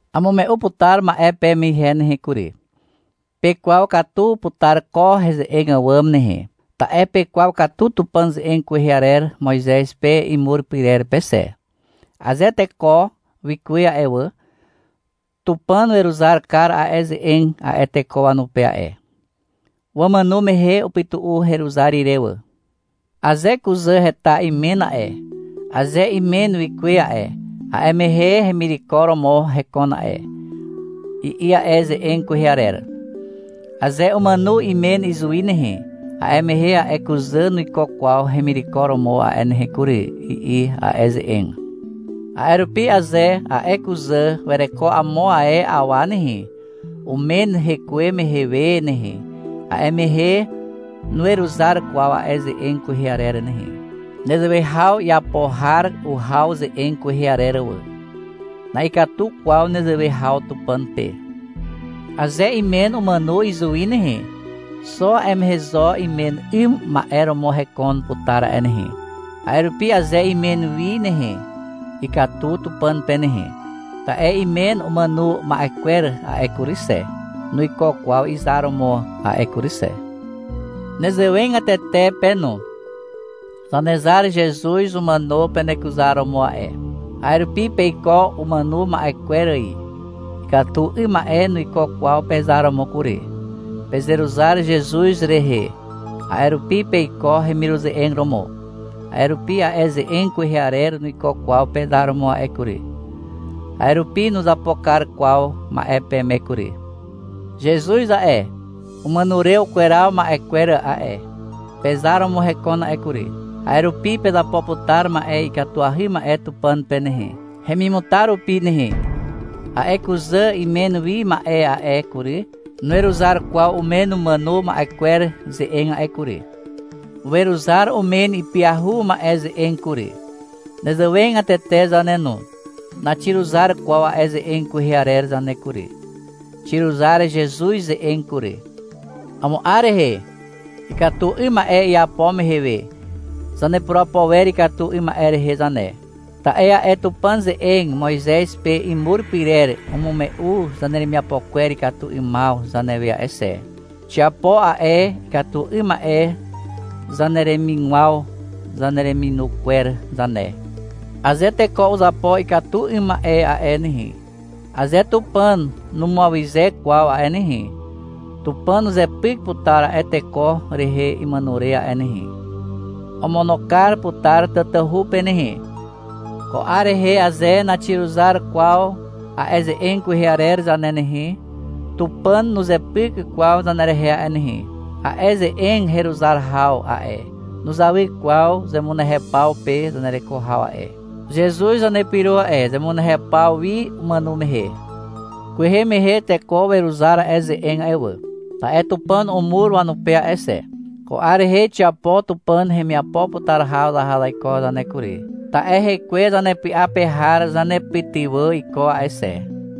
Amume'u putar ma'e peme ihe nehe kury. Pekwaw katu putar ko heze'eg àwàm nehe, ta'e pekwaw katu Tupàn ze'eg kwehe arer Moizez pe imur pyrer pe xe. Aze teko wikuwe a'e wà, Tupàn weruzar kar a'e ze'eg a'e teko wanupe a'e. Wamàno mehe upytu'u heruzar ire wà. — Aze kuzà heta imen a'e, aze imen wikuwe a'e, a'e mehe hemireko romo hekon a'e, i'i a'e ze'eg kwehe arer. — Aze umàno imen izuwi nehe, a'e mehe a'e kuzà nuiko kwaw hemireko romo a'e nehe kury, i'i a'e ze'eg. A'e rupi aze a'e kuzà wereko amo ae awa nehe, umen hekuwe mehe we nehe, a'e mehe nuweruzar kwaw a'e ze'eg kwehe arer nehe. Nezewe haw iapo har uhaw ze'eg kwehe arer wà. Na'ikatu kwaw nezewe haw Tupàn pe. Aze imen umàno izuwi nehe, xo a'e mehe zo imen 'ym ma'e romo hekon putar a'e nehe. A'e rupi aze imen wi nehe, ikatu Tupàn pe nehe. Ta'e imen umàno ma'e kwer a'e kury xe, nuiko kwaw izar romo a'e kury xe. Nezewegatete pe no. Zanezar Zezuz umàno penekuzar romo a'e. A'e rupi peiko umàno ma'e kwer ài. Ikatu 'ym ma'e nuiko kwaw pezar romo kury. Pezeruzar Zezuz rehe, a'e rupi peiko hemiruze'eg romo. A'e rupi a'e ze'eg kwehe arer nuiko kwaw pezar romo a'e kury. A'e rupi nuzapo kar kwaw ma'e peme kury. Zezuz a'e, umàno re ukweraw ma'e kwer a'e, pezar romo hekon a'e kury. A'e rupi pezapo putar ma'e ikatuahy ma'e Tupàn pe nehe, hemimutar rupi nehe. A'e kuzà imen wi ma'e a'e kury, nuweruzar kwaw umen umàno ma'e kwer ze'eg a'e kury. Weruzar umen ipyahu ma'e ze'eg kury. Nezewegatete zane no, naxiruzar kwaw a'e ze'eg kwehe arer zane kury. Xiruzar Zezuz ze'eg kury. Amo 'ar rehe, ikatu 'ym ma'e iapo mehe we, zanepurapo wer ikatu 'ym ma'e rehe zane, ta'e a'e Tupàn ze'eg Moizez pe imur pyrer umume'u zaneremiapo kwer ikatu 'ymaw zanewe a'e xe. Xiapo a'e ikatu 'ym ma'e zaneremigwaw zanereminu kwer zane. Aze teko uzapo ikatu 'ym ma'e a'e nehe, (aze Tupàn numuawyze kwaw a'e nehe), Tupàn uzepyk putar a'e teko rehe imàno re a'e nehe. (Omono kar putar tatahu pe nehe.) Ko 'ar rehe aze naxiruzar kwaw a'e ze'eg kwehe arer zane nehe, Tupàn nuzepyk kwaw zanerehe a'e nehe. A'e ze'eg heruzar haw a'e, nuzawy kwaw zemunehew paw pe zanereko haw a'e. Zezuz zanepyro a'e zemunehew paw wi, umàno mehe. Kwehe mehe teko weruzar a'e ze'eg a'e wà, ta'e Tupàn umur wanupe a'e xe. Ko 'ar rehe xiapo Tupàn hemiapo putar haw zaha zaiko zane kury, ta'e hekwe zanepy'a pe har zanepytywà iko a'e xe.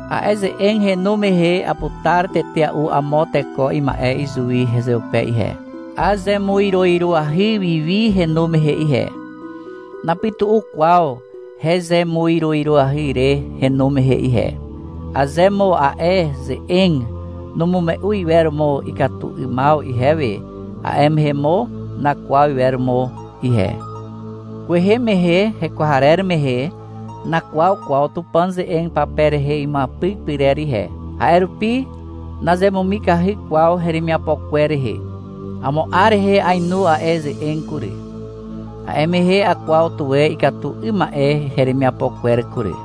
A'e ze'eg henu mehe aputar tetea'u amo teko ima'e izuwi hezeupe ihe. Azemuiroiroahy wi wi henu mehe ihe. Napytu'u kwaw hezemuiroiroahy re henu mehe ihe. Aze mo a'e ze'eg numume'u iwer mo ikatu 'ymaw ihewe, a'e mehe mo nakwaw iwer mo ihe. Kwehe mehe hekwarer mehe nakwaw kwaw Tupàn ze'eg pape rehe imuapyk pyrer ihe. A'e rupi nazemumikahy kwaw heremiapo kwer rehe. Amo 'ar rehe ainu a'e ze'eg kury. A'e mehe akwaw tuwe ikatu 'ym ma'e heremiapo kwer kury.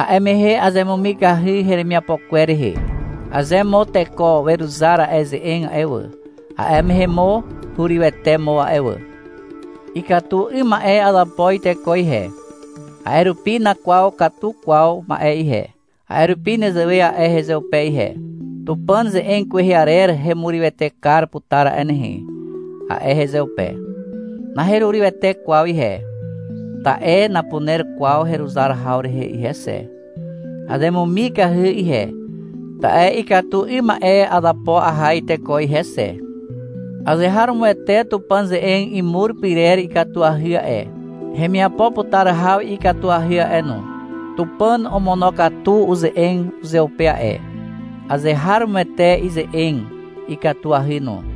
A'e mehe azemumikahy heremiapo kwer rehe. Aze mo teko weruzar a'e ze'eg a'e wà, a'e mehe mo hurywete mo a'e wà. Ikatu 'ym ma'e azapo iteko ihe. A'e rupi nakwaw katu kwaw ma'e ihe. A'e rupi nezewe a'e hezeupe ihe. — Tupàn ze'eg kwehe arer hemurywete kar putar a'e nehe, a'e hezeupe. Naherurywete kwaw ihe, ta'e napuner kwaw heruzar haw rehe ihe xe. Azemumikahy ihe, ta'e ikatu 'ym ma'e azapo aha iteko ihe xe. Azeharomoete Tupàn ze'eg imur pyrer ikatuahy a'e, hemiapo putar haw ikatuahy a'e no. Tupàn omonokatu uze'eg uzeupe a'e. Azeharomoete ize'eg. Ikatuahy no.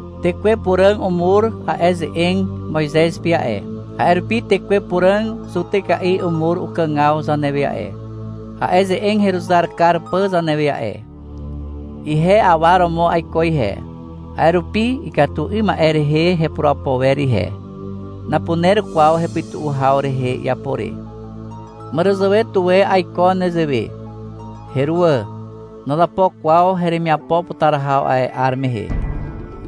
Tekwe Puràg umur a'e ze'eg Moizez pe a'e. A'e rupi Tekwe Puràg zutyka'i umur ukàgaw zanewe a'e, a'e ze'eg heruzar kar pà zanewe a'e. Ihe awa romo aiko ihe, a'e rupi ikatu 'ym ma'e rehe hepurapo wer ihe. Napuner kwaw hepytu'u haw rehe iapo re. Màràzàwe tuwe aiko nezewe. Heruwà. Nazapo kwaw heremiapo putar haw a'e 'ar mehe.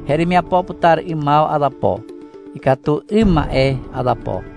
Heremiapo putar 'ymaw azapo. Ikatu 'ym ma'e azapo.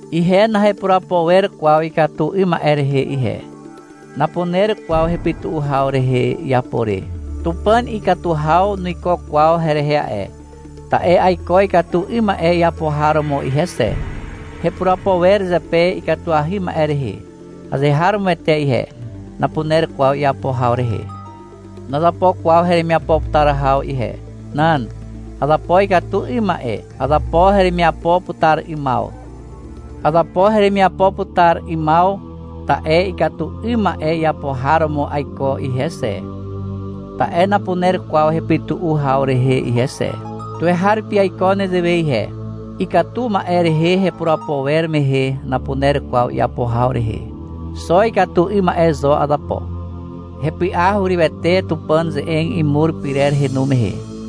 Ihe nahepurapo wer kwaw ikatu 'ym ma'e rehe ihe. Napuner kwaw hepytu'u haw rehe iapo re. Tupàn ikatu haw nuiko kwaw herehe a'e, ta'e aiko ikatu 'ym ma'e iapo har romo ihe xe. Hepurapo wer zepe ikatuahy ma'e rehe azeharomoete ihe. Napuner kwaw iapo haw rehe. Nazapo kwaw heremiapo putar haw ihe. Nan. Azapo ikatu 'ym ma'e. Azapo heremiapo putar 'ymaw. Azapo heremiapo putar 'ymaw, ta'e ikatu 'ym ma'e iapo har romo aiko ihe xe, ta'e napuner kwaw hepytu'u haw rehe ihe xe. Tuweharupi aiko nezewe ihe. Ikatu ma'e rehe hepurapo wer mehe napuner kwaw iapo haw rehe. Xo ikatu 'ym ma'e zo azapo. Hepy'a hurywete Tupàn ze'eg imur pyrer henu mehe.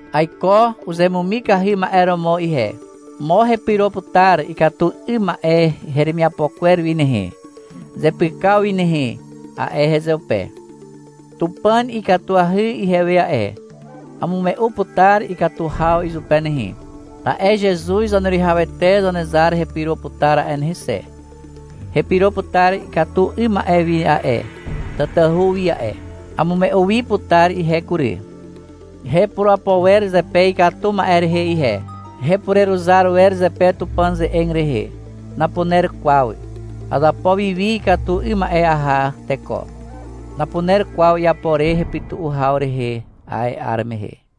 Aiko uzemumikahy ma'e romo ihe. — Mo hepyro putar ikatu 'ym ma'e heremiapo kwer wi nehe, zepykaw wi nehe, a'e hezeupe. Tupàn ikatuahy ihewe a'e. Amume'u putar ikatu haw izupe nehe. Ta'e Zezuz Zaneruwihawete Zanezar hepyro putar a'e nehe xe. Hepyro putar ikatu 'ym ma'e wi a'e, tatahu wi a'e. Amume'u wi putar ihe kury. Hepurapo wer zepe ikatu ma'e rehe ihe. Hepureruzar wer zepe Tupàn ze'eg rehe. Napuner kwaw. Azapo wi wi ikatu 'ym ma'e aha teko. Napuner kwaw iapo re hepytu'u haw rehe a'e 'ar mehe.